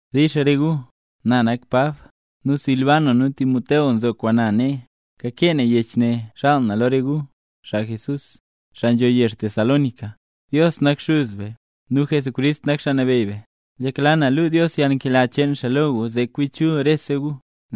Dix re gu. Na nak Pab; nu Silban nu Timoteo nzo kwaan na nee. Kakee na yech ne xaal na lo re gu, xaa Jesús, xaa nzho yezh Tesalónica. Dios nak Xuz be, nu Jesucrist nak Xaa Nabeyy be. Nzhekla na luu Dios yalnkela cheen xaa lo gu zee chul kwi rese gu.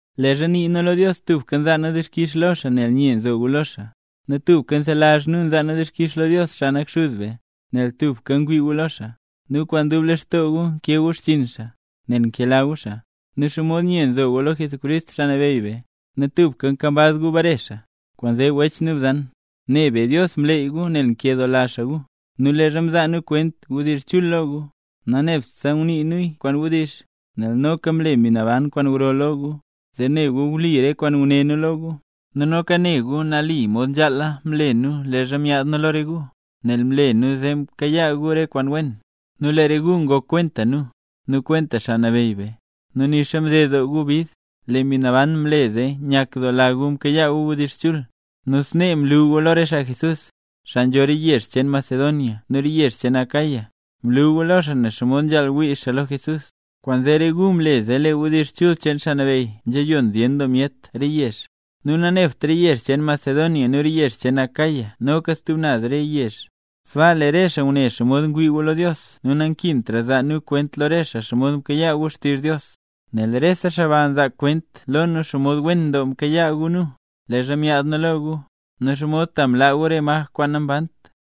Leezha nii nu lo Dios tubka nzaa nu dixkix lo xaa nel nye nzo gu lo xaa. Nu tubka nselazh nu nzaa nu dixkix lo Dios, xaa nak xuz be, nel tubka ngwii gu lo xaa, nu kwaan dub lextoo gu nkee gu xchiin xaa, nel nkela gu xaa, nu xomod nye nzo gu lo Jesucrist Xaa Nabeyy be, nu tubka nkambaz gu bare xaa. Kwaanzee wech nu bzan, ne be Dios mleey gu nel nkedoola xaa gu. Nu leezha mzaa nu kwent wdizh chul lo gu, nanebtse ngunii nuya kwaan wdizh, nel noka mle Mbi Naban kwaan gro lo gu, zee ne gu wli re kwaan nguné nu lo gu. Nu noka ne gu nali mod nzhale mle nu leezha myaad nu lo re gu, nel mle nu zee mkayaa gu re kwaan wen. Nu lee re gu ngok kwenta nu, nu kwenta Xaa Nabeyy be. Nu nixa mded doo gu bid, lee Mbi Naban mle zee nyakdoola gu mkayaa gu wdizh chul. Nu snee mlu gu lo re xaa Jesús, xaa nzho re yezh cheen Macedonia nu re yezh cheen Acaya, mlu gu lo xaa nen xomod nzhaal wii xaa lo Jesús. Kwaanzee re gu mle zee lee wdizh chul cheen Xaa Nabeyy nzhayon zyen doo myet re yezh, nu nanebt re yezh cheen Macedonia nu re yezh cheen Acaya noka stub naz re yezh, sbaa lee re xaa ngune xomod ngwii gu lo Dios nu nankintra zaa nu kwent lo re xaa xomod mkayaa gu xtizh Dios. Nel rese xaa ba nzaa kwent lo nu xomod wen doo mkayaa gu nu, leezha myaad nu lo gu, nu xomod ta mlaa gu re maj kwaan nambant,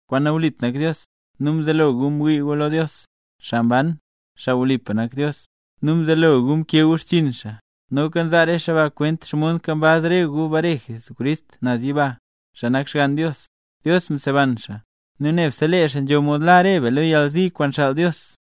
kwaan nawlit nak Dios, nu mzelo gu mwii gu lo Dios, xaa mban, xaa wlipa nak Dios, nu mzelo gu mkee gu xchiin xaa. Noka nzaa re xaa ba kwent xomod nkambaz re gu bare Jesucrist naz yiba, xaa nak Xgann Dios. Dios mseban xaa. Nu nebse lee xaa nzho mod la re be lo yalzi kwaan xaal Dios.